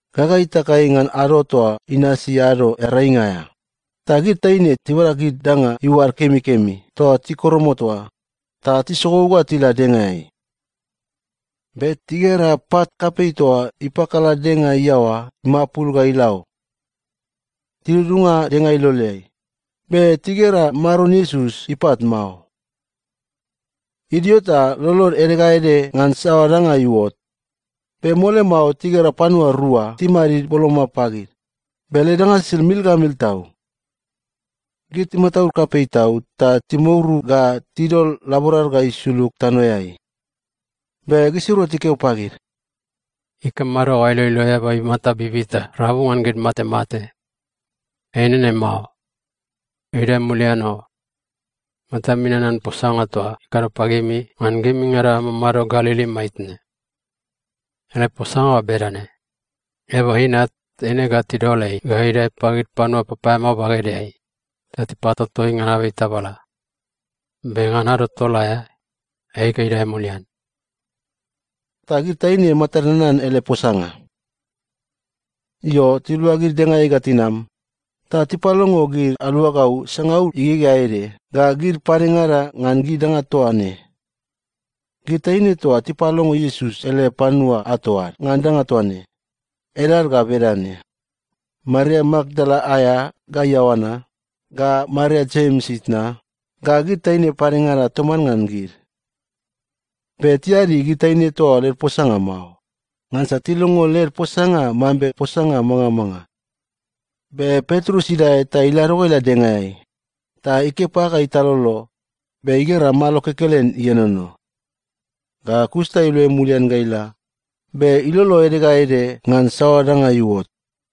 Gaga itakai ngan ado toa inasi Ado Earainga aea, ta gid taine tibada gid danga iuad kemikemi toa tikoromot oa ta tisogou ga tila dengaeai. Be tigera pat kapei toa ipakala denga iaoa imapul ga ila o. Tidudunga denga iloleai, be tigera Maron Iesus ipat mao. Idio ta lolod ede ga ede ngan saoa danga iuot, be mole mao tigera panua rua timadid boloma pagid, be led danga sisid mil ga mil tau. Gid timataud kapei tau ta timouru ga tidol laborad ga isulug tanoeai. Be gisirua tikeo pagid, “Ikamado ga ailoilo eaba imata bibita rabu ngan gid matemate? Ei nene mao. Idae mulian o! Matami nanan posanga toa ikado pagimi ngan gimingada amamado Galili maitne. Ele posanga ga bedane, ‘Eaba Inat, eine ga tidol ei ga idae pagid panua papaeamao bagedeai, ta tipatoto ei ngan abei tabala. Be ngan ado tol aea, ei ga idae mulian.’” Ta gid taine matad nanan ele posanga. Io, tiluagid dengaeai ga tinam, ta tipalongo gid aluagau sangaul igegea ede ga gid padengada ngan gid danga toa ne. Gid taine toa tipalongo Iesus ele panua ato ad ngan danga toa ne, edad ga bedane: Maria Makdala aea, ga Ioana, ga Maria Jems itna, ga gid taine padengada toman ngan gid. Be tiadi gid taine toa oa led posanga mao, ngansa tilongo led posanga mambe posanga mangamanga. Be Petrus idae ta ilado ga ila dengaeai, ta ikepa ga italolo, be igera malo kekelen ienono. Ga kus ta iluai mulian ga ila, be ilolo ede ga ede ngan saoa danga iuot.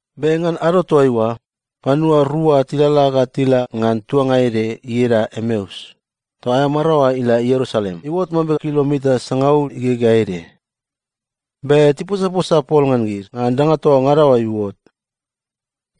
Be ngan ado toaiua, panua rua tilalala ga tila ngan tuanga ede ieda Emeus, toa aea maraoa ila Ierusalem iuot mambe kilomita sangaul igegea ede. Be tiposaposa pol ngan gid ngan danga toa ngada oa iuot.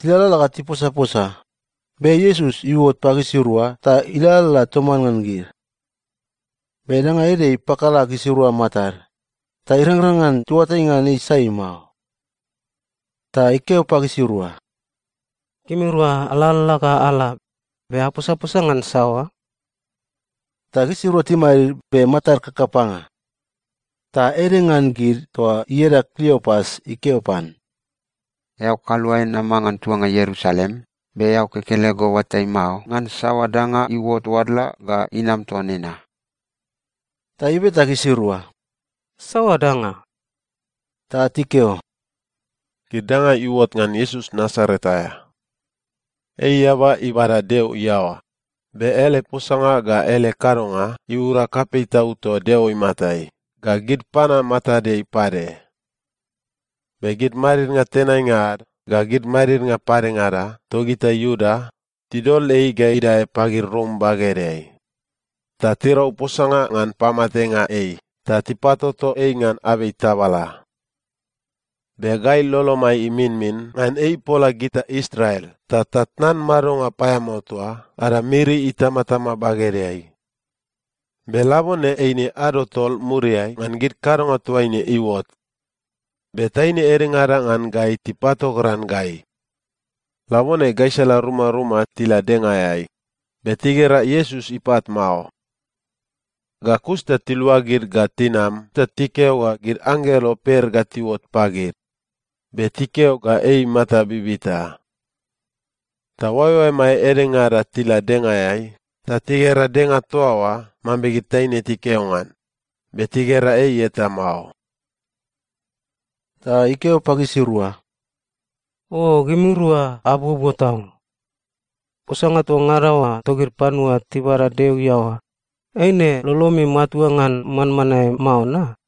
Tilalala ga tiposaposa, be Iesus iuot pagisirua ta ilalala toman ngan gid. Be danga ede ipakala gisirua matad, ta irangrang ngan tiuatai ngan ei sai mao. Ta ikeo pagisirua, “Gimirua alalala ga ala, be aposaposa ngan saoa?” Ta gisirua timadid, be matad kakapanga. Ta ede ngan gid toa ieda Kliopas ikeo pan, “Eao kaluae nama ngan tuanga Ierusalem, be eao kekelego oatai mao ngan saoa danga iuot oadla ga inam toa nena?” Ta ibeta gisirua, “Saoa danga?” Ta tikeo, “Gid danga iuot ngan Iesus Nasaret aea. Ei eaba ibada Deo iaoa, be ele posanga ga ele kadonga iura kapei tau toa Deo imatai ga gid panua matadeai pade. Be gid madidnga tenainga ad ga gid madidnga padengada togita Iuda tidol ei ga idae pagid Rom bagedeai, ta tirau posanga ngan pamatenga ei ta tipatoto ei ngan abei tabala. Be gai lolomai iminmin ngan ei ipola gita Israel ta tatnan madonga paeamao toa ada miri itamatama bagedeai. Be labone eine ado tol muriai ngan gid kadonga toa ne iuot. Be taine edengada ngan gai tipatogran gai. Labone gaisala rumaruma tila dengaeai, be tigera Iesus ipat mao. Ga kus ta tiluagid ga tinam ta tikeo ga gid anggelo per ga tiuot pagid, be tikeo ga ei imata bibita. Ta oaeoaemai edengada tila dengaeai ta tigera denga toa oa mambe gid taine tikeo ngan, be tigera ei eta mao.” Ta ikeo pagisirua, “O gimirua abuobuo tau! Posanga toa ngada oa togid panua tibada Deo iaoa, eine lolomi matua ngan manmanae mao na?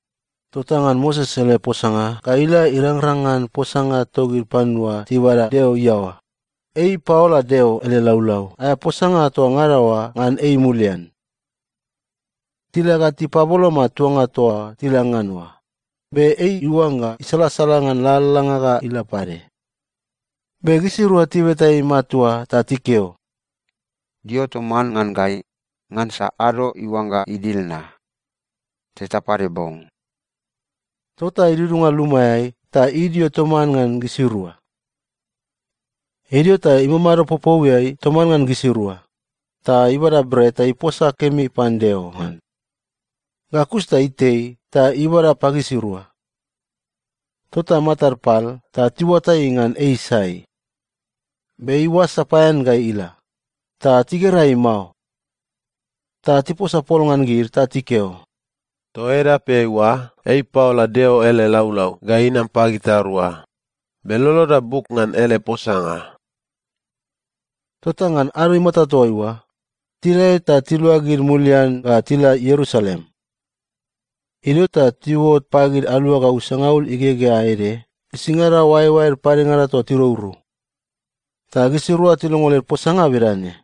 Tota ngan Moses ele posanga ga ila irangrang ngan posanga togid panua tibada Deo iaoa, ei ipaola Deo ele laulau aea posanga toa ngada oa ngan ei mulian. Tila ga tipaboloma tuanga toa tila ngan oa, be ei iuangga isalasala ngan lalalanga ga ila pade. Be gisirua tibeta ei matua ta tikeo, “Dio toman ngan gai, ngansa ado iuangga idil na. Teta pade bong.” Tota idudunga lumaeai ta idio toman ngan gisirua. Idio ta imamado popouiai toman ngan gisirua, ta ibada bret ta iposa kemi pan Deo ngan. Ga kus ta itei ta ibada pagisirua. Tota matad pal ta tiuatai ngan ei sai. Be ei oas sapaean ga ila, ta tigera ei mao. Ta tiposa pol ngan gid ta tikeo, “Toa edapeai oa ei ipaola Deo ele laulau ga inam pagitarua, be loloda buk ngan ele posanga!” Tota ngan ado imata toa oa, tidae ta tiluagid mulian ga tila Ierusalem. Idio ta tiuot pagid aluagau sangaul igegea ede gisingada oaeoaed padengada toa tirourou. Ta gisirua tilongo led posanga bedane,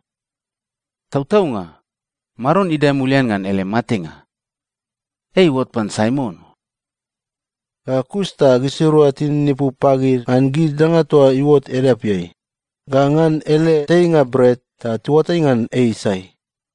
“Tautaunga, Maron idae mulian ngan ele matenga! Ei iuot pan Saimon o.” Ga kus ta gisirua tininipu pagid ngan gid danga toa iuot edapeai, ga ngan ele teinga bret ta tiuatai ngan ei sai.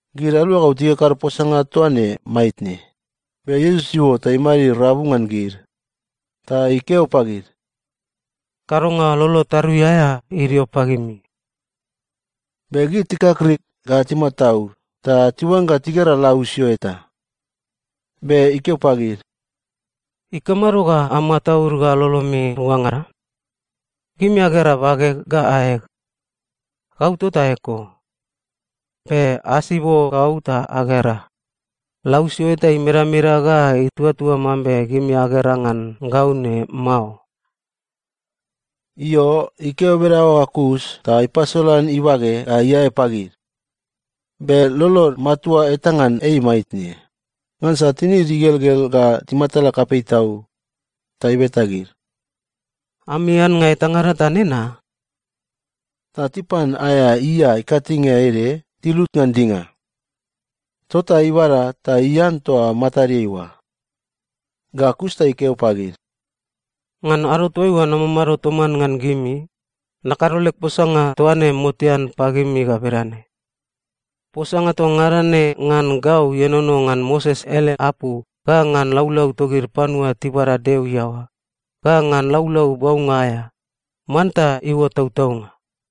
Gid aluagau tikakado posanga toa ne maitne, be Iesus iuot ta imadid rabu ngan gid. Ta ikeo pagid, “Kadonga lolo tarui aea idio pagimi!” Be gid tikakrik ga timataud ta tiuangga tigera lausio eta. Be ikeo pagid, “Ikamado ga amataud ga lolomi ruangada? Gimi agera bageg ga aeg. Gau tota eko. Be asibo gau ta agera, lausio eta imedameda ga ituatua mambe gimi agera ngan gau ne mao.” Io, ikeo bedaoa ga kus ta ipasolan ibage ga iae pagid. Be lolod matua eta ngan ei maitne, ngansa tinid igelgel ga timatala kapei tau. Ta ibeta gid, “Ami annga etangada ta nena?” Ta tipan aea ia ikatinge ede tilut ngan dinga. Tota ibada ta ian toa matadeai oa. Ga kus ta ikeo pagid, “Ngan ado toaiua namamado toman ngan gimi, nakado leg posanga toa ne motean pagimi ga bedane: Posanga toa ngada ne ngan gau ienono ngan Moses ele apu, ga ngan laulau togid panua tibada Deo iaoa, ga ngan Laulau Baunga aea, manta iuot tautaunga.”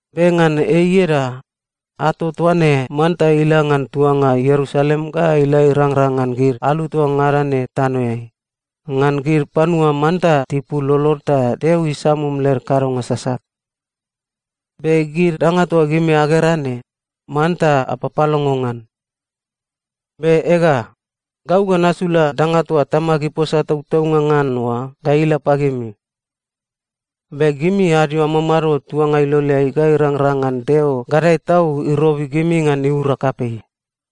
Be ngan ei ieda, ato toa ne manta ila ngan tuanga Ierusalem ga ila irangrang ngan gid alu toa ngada ne tanoeai, ngan gid panua manta tipul lolod ta Deo isamum led kadonga sasat. Be gid danga toa gimi agera ne, manta apapalongo ngan. Be ega, gau ga nasula danga toa Tamag iposa tautaunga ngan oa ga ila pagimi. Be gimi adio amamado tuanga iloleai ga irangrang ngan Deo gadae tau irobi gimi ngan iura kapei.”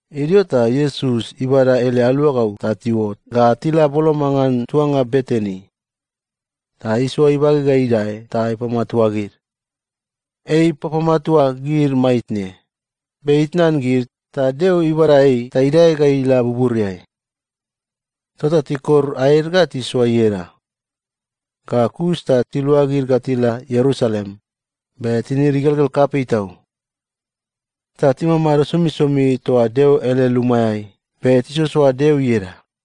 Idio ta Iesus ibada ele aluagau ta tiuot ga tila boloma ngan tuanga Betani. Ta isoa ibage ga idae ta ipamatua gid. Ei ipapamatua gid maitne, be itnan gid, ta Deo ibada ei ta idae ga ila buburiai. Tota tikor aed ga tisoa ieda. Ga kus ta tiluagid ga tila Ierusalem, be tinid igelgel kapei tau. Ta timamado somisomi toa Deo ele lumaeai be tisoasoa Deo ieda.